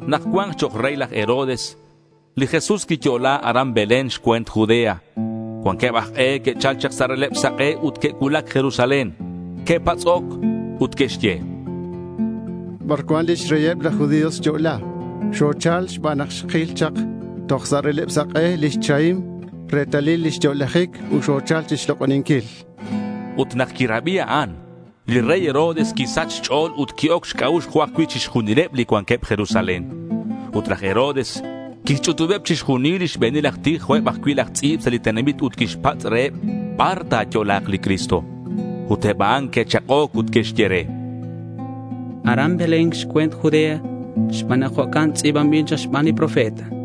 Nak cua̱nk chok' rey laj Herodes, li Jesús quiyo'la aran Belén xcue̱nt Judea. Cuanqueb aj k'e que'chal chak sa' releb sak'e ut que'cuulac Jerusalén. Que'patz'oc ut que'xye: —¿Bar cuan lix reyeb laj judío xyo'la? Xochal xban nak xkil chak toj sa' releb sak'e li chahim retalil lix yo'lajic ut xochal chixlok'oninquil, chanqueb. Ut nak quirabi a'an, li rey Herodes quisach xch'o̱l ut qui-oc xc'a'ux jo' ajcui' chixjunileb li cuanqueb Jerusalén. Ut laj Herodes quixch'utubeb chixjunil li xbe̱nil aj tij jo' eb ajcui' laj tz'i̱b sa' li tenamit ut quixpatz' reheb bar ta̱yo'la̱k li Cristo. Ut eb a'an que'chak'oc ut que'xye re: —Aran Belén xcue̱nt Judea xban nak jo'can tz'i̱banbil chak xban li profeta.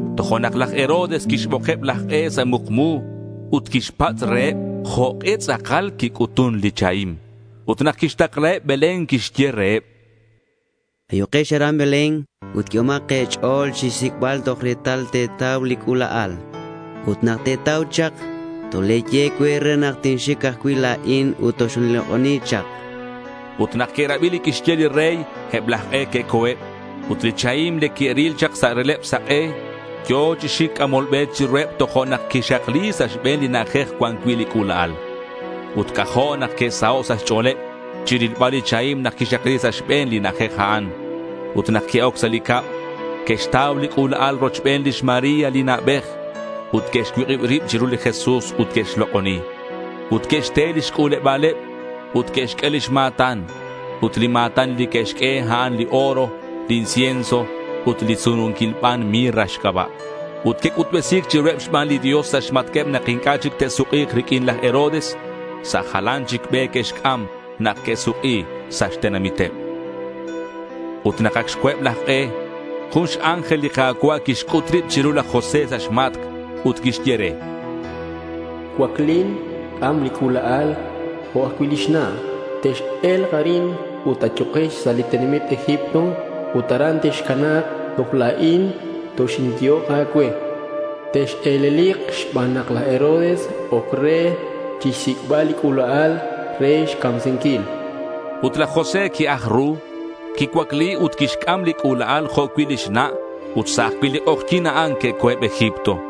Tojo'nak laj Herodes quixbokeb laj k'e sa' mukmu ut quixpatz' reheb jok'e tz'akal quic'utun li chahim. Ut nak quixtaklaheb Belén quixye reheb: —Ayukex aran Belén ut q'uehomak e̱ch'o̱l chixsic'bal toj retal te̱tau li c'ula'al. Ut nak te̱tau chak, tole̱ye cue re nak tinxic ajcui' la̱in ut toxinlok'oni chak, chan. Ut nak que'rabi li quixye li rey, eb laj k'e que'co̱eb. Ut li chahim li que'ril chak sa' releb sak'e yo̱ chi xic c'amol be chiruheb tojo'nak quixakli sa' xbe̱n li na'ajej cuan cui' li c'ula'al. Ut c'ajo' nak que'saho' sa' xch'o̱leb chirilbal li chahim nak quixakli sa' xbe̱n li na'ajej a'an. Ut nak que'oc sa' li cab, que'xtau li c'ula'al rochben lix María li na'bej. Ut que'xcuik'ib rib chiru li Jesús ut que'xlok'oni. Ut que'xte lix c'u̱leba̱leb ut que'xq'ue lix ma̱tan. Ut li ma̱tan li que'xq'ue, a'an li oro, li incienso ut li sununquil ban mirra xc'aba'. Ut que'c'utbesi̱c chiruheb xban li Dios sa' xmatq'ueb nak inc'a' chic te'suk'i̱k riq'uin laj Herodes. Sa' jalan chic be que'xc'am nak que'suk'i sa' xtenamiteb. Ut nak ac xco̱eb laj k'e, jun x-ángel li Ka̱cua' quixc'ut rib chiru laj José sa' xmatc' ut quixye re: —Cuaclin, c'am li c'ula'al jo' cui' lix na'. Tex-e̱lk arin ut ayukex sa' li tenamit Egipto. Ut aran texcana̱k toj la̱in toxinyehok a̱cue. Tex-e̱lelik xban nak laj Herodes oc re chixsic'bal li c'ula'al re xcamsinquil.— Ut laj José qui-aj ru, quicuacli ut quixc'am li c'ula'al jo' cui' lix na' ut sa' ajcui' li k'ojyi̱n a'an que'co̱eb Egipto.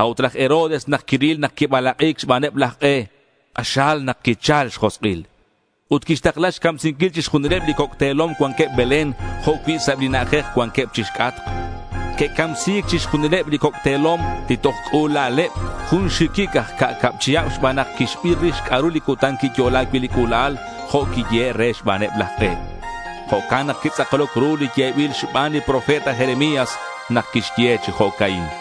A'ut laj Herodes nak quiril nak quibalak'i̱c xbaneb laj k'e, k'axal nak quichal xjosk'il. Ut quixtakla xcamsinquil chixjunileb li coc' te̱lom cuanqueb Belén, jo' cui' sa' eb li na'ajej cuanqueb chixc'atk. Que'camsi̱c chixjunileb li coc' te̱lom li toj c'ula'aleb jun xxiquic aj ca'cab chihab xban nak quixbir rix c'a'ru li cutan quiyo'la cui' li c'ula'al jo' quiyehe' re xbaneb laj k'e. Jo'can nak quitz'akloc ru li yebil xban li profeta Jeremías nak quixye chi jo'ca'in: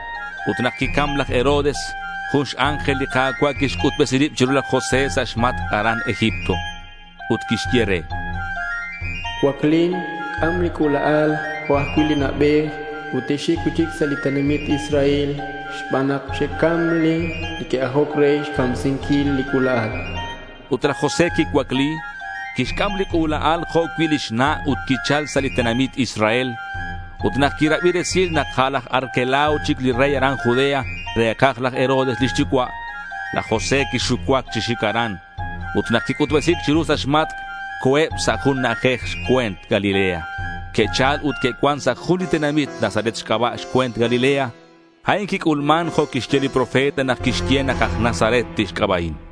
Ut nak quicam laj Herodes, jun x-ángel li Ka̱cua' quixc'utbesi rib chiru laj José sa' xmatc' aran Egipto. Ut quixye re: —Cuaclin. C'am li c'ula'al jo' cui' li na'bej ut texxic cui'chic sa' li tenamit Israel xban nak xe'cam li que'ajoc re xcamsinquil li c'ula'al, chan. Ut laj José quicuacli, quixc'am li c'ula'al jo' cui' lix na' ut quichal sa' li tenamit Israel. Ut nak quirabi resil nak a' laj Arquelao chic li rey aran Judea re̱kaj laj Herodes lix yucua', laj José quixucuac chi xic aran. Ut nak quic'utbesi̱c chiru sa' xmatc', que'co̱eb sa' jun na'ajej xcue̱nt Galilea. Que'chal ut que'cuan sa' jun li tenamit Nazaret xc'aba' xcue̱nt Galilea. A'in quic'ulman jo' que'xye li profeta nak que'xye nak aj Nazaret tixc'aba'in.